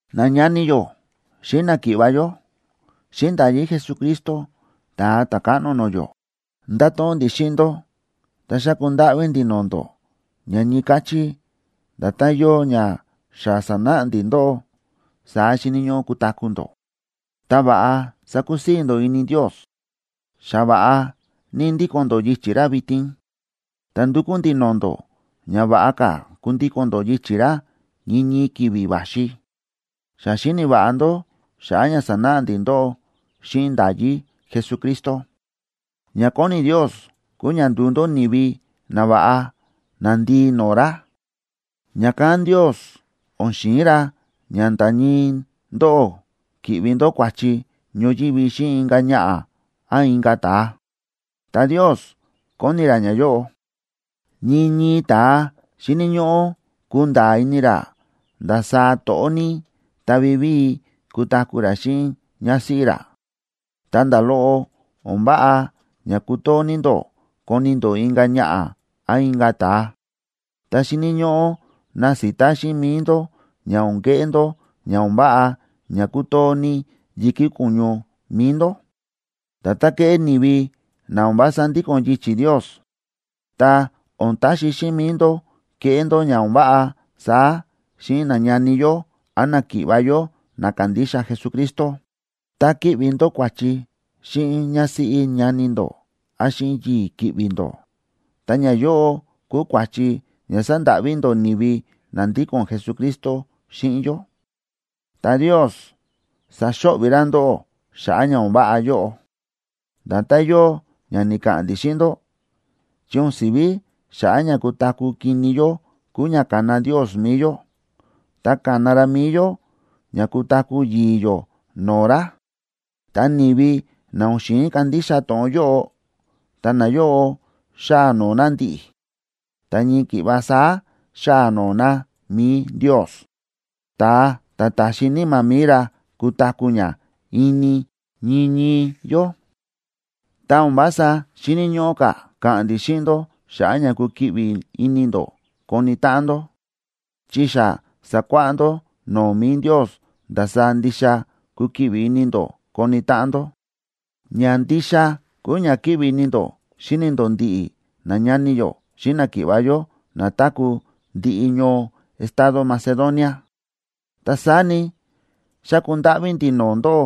Nañani yó xíꞌin náki̱ꞌva̱ yó, xíꞌin nda̱yí Jesucristo, Ta̱a Ta̱káꞌno no̱o̱ yó, ndáto̱ꞌon ndi̱ xíꞌin ndó ta xáku ndáꞌví ndi̱ no̱o̱ ndó ña ñii káchí nda̱tán yóo ña xa sa̱náꞌa ndi̱ ndóꞌó, saá xíni̱ ñóꞌó kutaku̱ ndó, ta va̱ꞌa sakusii̱ ndó ini Ndios. Xa va̱ꞌa ní ndíko̱n ndó yichi̱ ra vitin, ta ndúkú ndi̱ no̱o̱ ndó ña va̱ꞌa ka̱ kundíko̱n ndó yichi̱ ra ñii ñii ki̱vi̱ va̱xi. Xa xíni̱ va̱ꞌa ndó xa̱ꞌa̱ ña sa̱náꞌa ndi̱ ndóꞌó xíꞌin nda̱yí Jesucristo. Ña kóni Ndios kúu ña nduu ndó ni̱vi nava̱ꞌa, nandii no̱o̱ ra. Ña̱kán Ndios o̱n xi̱in ra ña nda̱ ñii ndóꞌó ki̱ꞌvi ndó kua̱chi ñoyívi xíꞌin inka̱ ñaꞌa̱ án inka̱ ta̱a. Ta Ndios kóni ra ñayóꞌo: Ñii ñii ta̱a xíni̱ ñóꞌó kunda̱a̱ ini ra ndasaá to̱ꞌó ní ta vivíi kutaku̱ ra xíꞌin ñásíꞌí ra. Ta nda̱ loꞌo o̱n váꞌa ña kutoo ní ndó koni ndó inka̱ ñaꞌa̱ án inka̱ ta̱a, ta xíni̱ ñóꞌó nasita xíꞌin mi̱i ndó ña o̱n keꞌé ndó ña o̱n váꞌa ña kútoo ní yi̱kí ko̱ñu mi̱i ndó, nda̱tán kéꞌé ni̱vi na o̱n vása ndíko̱n yichi̱ Ndios. Ta o̱n taxi xíꞌin mi̱i ndó keꞌé ndó ña o̱n váꞌa saá xíꞌin nañani yó án náki̱ꞌva̱ yó na kándixa Jesucristo. Tá ki̱ꞌvi ndó kua̱chi xíꞌin ñásíꞌí ñani ndó án xíꞌin yii̱ ki̱ꞌvi̱ ndó, ta̱ ñayóꞌo kúu kua̱chi ña sándáꞌví ndó ni̱vi na ndíko̱n Jesucristo xíꞌin yó, ta Ndios saxo̱ꞌvi̱ ra ndóꞌó xa̱ꞌa̱ ña o̱n váꞌa yóꞌo, nda̱tán yóo ña ni̱ka̱ꞌa̱n ndi̱ xíꞌin ndó. Chi o̱n si̱ví xa̱ꞌa̱ ña kutaku̱ kini yó kúu ña ka̱na Ndios mi̱i yó, ta ka̱na ra mi̱i yó ña kutaku̱ yi̱i̱ yó no̱o̱ ra. Ta ni̱vi na o̱n xi̱in kandixa to̱ꞌon yóꞌo, ta nayóꞌo xáa noo na ndi̱ꞌi̱, ta ñii ki̱ꞌva saá xáa noo na mi̱i Ndios, ta̱a ta̱ ta̱xi Níma̱ mi̱i ra kutaku̱ ña ini ñii ñii yó. Ta o̱n vása xíni̱ ñóꞌó ka̱ ka̱ꞌa̱n ndi̱ xíꞌin ndó xa̱ꞌa̱ ña kukiꞌvi ini ndó koni táꞌan ndó, chi xa sa̱kuáꞌá ndó no̱o̱ mi̱i Ndios ndasaá ndixa kukiꞌvi ini ndó koni táꞌan ndó. Ña ndixa kúu ña kíꞌvi ini ndó xíni ndó ndiꞌi nañani yó xíꞌin náki̱ꞌva̱ yó na táku̱ ndiꞌi ñoo estado Macedonia. Ta saá ni, xáku ndáꞌví ndi̱ no̱o̱ ndóꞌó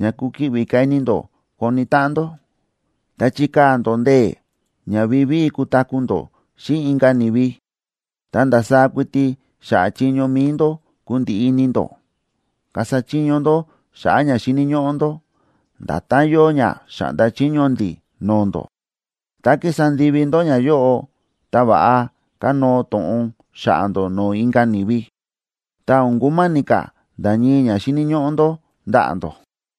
ña kukiꞌvi ka̱ ini ndó koni táꞌan ndó, ta chikaa̱ ndó ndee̱ ña vivíi kutaku̱ ndó xíꞌin inka̱ ni̱vi, ta ndasaá kuiti xa̱ꞌa̱ chiño mi̱i ndó kundiꞌi ini ndó. Kasa chiño ndó xa̱ꞌa̱ ña xíni̱ ñóꞌó ndó, nda̱tán yóo ña xa̱ꞌnda chiño ndi̱ no̱o̱ ndó. Tá kísa ndivi ndó ñayóꞌo, ta va̱ꞌa kanóo to̱ꞌon xa̱ꞌa̱ ndó no̱o̱ inka̱ ni̱vi, ta o̱n kuma̱ni̱ ka̱ nda̱ ñii ña xíni̱ ñóꞌó ndó ndaꞌa̱ ndó.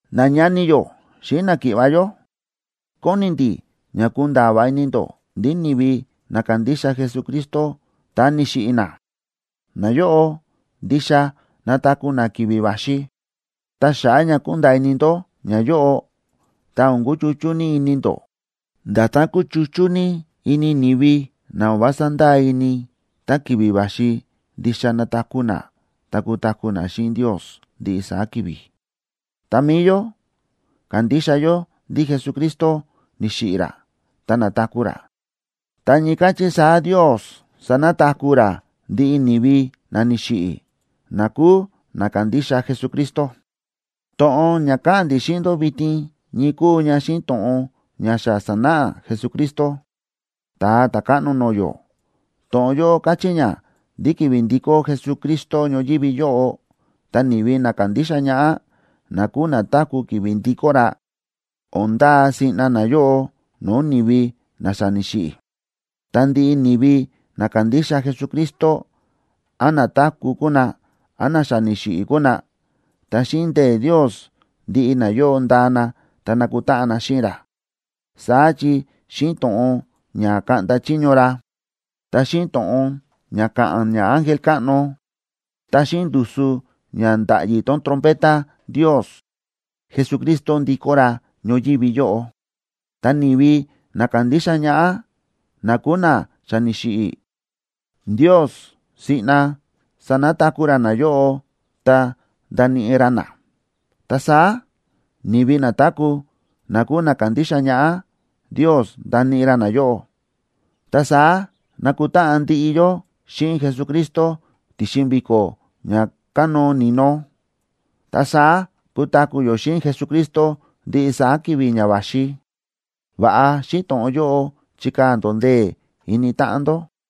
Nañani yó xíꞌin náki̱ꞌva̱ yó, kóni ndi̱ ña kunda̱a̱ va̱ꞌa ini ndó ndí ni̱vi na kándixa Jesucristo ta ni̱xiꞌi̱ na, nayóꞌo ndixa nataku̱ na ki̱vi̱ va̱xi. Ta xa̱ꞌa̱ ña kúnda̱a̱ ini ndó ñayóꞌo, ta o̱n kuchuchú ní ini ndó, nda̱tán kúchuchú ní ini ni̱vi na o̱n vása ndáa ini ndí ki̱vi̱ va̱xi ndixa nataku̱ na ta kutaku̱ na xíꞌin Ndios ndiꞌi saá ki̱vi̱. Ta mi̱i yó, kándixa yó ndí Jesucristo ni̱xiꞌi̱ ra ta na̱taku̱ ra, ta ñii káchí saá Ndios sanataku̱ ra ndiꞌi ni̱vi na ni̱xiꞌi̱, na kúu na kándixa Jesucristo. To̱ꞌon ña káꞌa̱n ndi̱ xíꞌin ndó vitin ñii kúu ña xíꞌin to̱ꞌon ña xa sa̱náꞌa Jesucristo, Ta̱a Ta̱káꞌno no̱o̱ yó. To̱ꞌon yóꞌo káchí ña ndí ki̱vi̱ ndikó Jesucristo ñoyívi yóꞌo, ta ni̱vi na kándixa ñaꞌá, na kúu na táku̱ ki̱vi̱ ndikó ra, o̱n ndaa siꞌna nayóꞌo no̱o̱ ni̱vi na xa ni̱xiꞌi̱, ta ndiꞌi ni̱vi na kándixa Jesucristo, án na táku̱ kuu na, án na xa ni̱xiꞌi̱ kuu na, ta xíꞌin ndee̱ Ndios ndiꞌi nayóꞌo ndaa na ta nakutáꞌan na xíꞌin ra. Saá chi xíꞌin to̱ꞌon ña kaꞌnda chiño ra, ta xíꞌin to̱ꞌon ña ka̱ꞌa̱n ñaángel káꞌno, ta xíꞌin ndusu ña nda̱ꞌyi tón trompeta Ndios, Jesucristo ndikó ra ñoyívi yóꞌo. Ta ni̱vi na ka̱ndixa ñaꞌá, na kúu na xa ni̱xiꞌi̱, Ndios siꞌna sanataku̱ ra nayóꞌo ta ndaníꞌi ra na. Ta saá, ni̱vi na táku̱, na kúu na kándixa ñaꞌá, Ndios ndaníꞌi ra nayóꞌo, ta saá nakutáꞌan ndiꞌi yó xíꞌin Jesucristo ti̱xin vi̱ko̱ ña kánóo ni̱no. Ta saá kutaku̱ yó xíꞌin Jesucristo ndiꞌi saá ki̱vi̱ ña va̱xi. Va̱ꞌa xíꞌin to̱ꞌon yóꞌo chikaa̱ ndó ndee̱ ini táꞌan ndó.